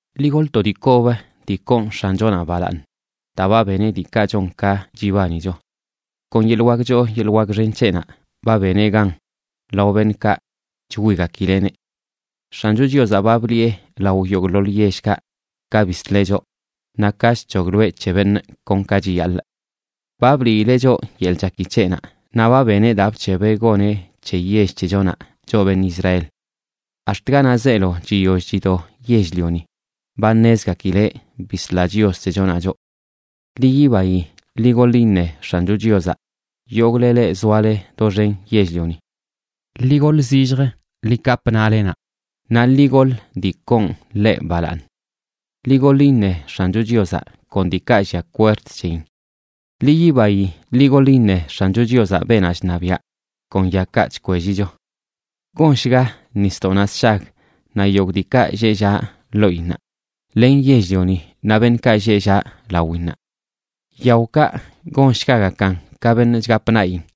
Ḻi goḻ to dii kob dii koon X̱anchonaꞌ balaaṉ, daa ba beneꞌ diikaꞌ chon ka chibanicho; kon yeḻꞌ wak choo yeḻꞌ wak xen c̱heꞌnaꞌ ba beneꞌ gan lao beṉꞌkaꞌ chwigakileꞌneꞌ. X̱ancho Chiozaꞌ ba bliꞌe lao yogꞌḻoḻ yellkaꞌ ka bisleꞌ choꞌ, naꞌ ka chc̱hogloeꞌ c̱he beṉꞌ kon ka chiyaḻꞌ. Ba bliileꞌ choꞌ yeḻꞌ chaki c̱heꞌnaꞌ naꞌ ba beneꞌ daa bc̱hebeꞌ goneꞌ c̱he yell c̱hechonaꞌ, choꞌ beṉꞌ Israel. Ax̱t ganaꞌ zeelo chiyoll chido yell-lioni ba ṉezgakileꞌ bisla Chios c̱hechonaꞌ choꞌ. Ḻi yibayi, ḻi goḻ iṉe X̱ancho Chiozaꞌ, yogꞌle leꞌ zoale doxen yell-lioni. Ḻi goḻ zillj, ḻi kapꞌ naꞌlenaꞌ naꞌ ḻi goḻ dii koon ḻeꞌ balaaṉ. Ḻi goḻ iṉe X̱anchoꞌ Chiozaꞌ, kon diikaꞌ llia kwerd c̱heyin. Ḻi yibayi ḻi goḻ iṉe X̱ancho Chiozaꞌ, beenaꞌ chṉabiaꞌ, kon yakaꞌ chkwellicho. Gonshga nisdoꞌnaꞌ sshag naꞌ yogꞌ diikaꞌ lleꞌ llaꞌ loꞌinnaꞌ, len yell-lioni naꞌ beṉꞌkaꞌ lleꞌ llaꞌ lawinnaꞌ. Yaokaꞌ gonshgagakan ka beṉꞌ chgapꞌ naꞌyin;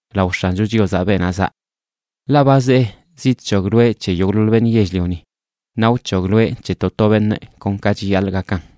lao X̱ancho Chiozaꞌ, beenaꞌ zaꞌ. Ḻaꞌ ba zee zidc̱hogloeꞌ c̱he yogꞌḻoḻ beṉꞌ yell-lioni; naꞌ wc̱hogloeꞌ c̱he to to beṉꞌ kon ka chiyaḻꞌ gakan.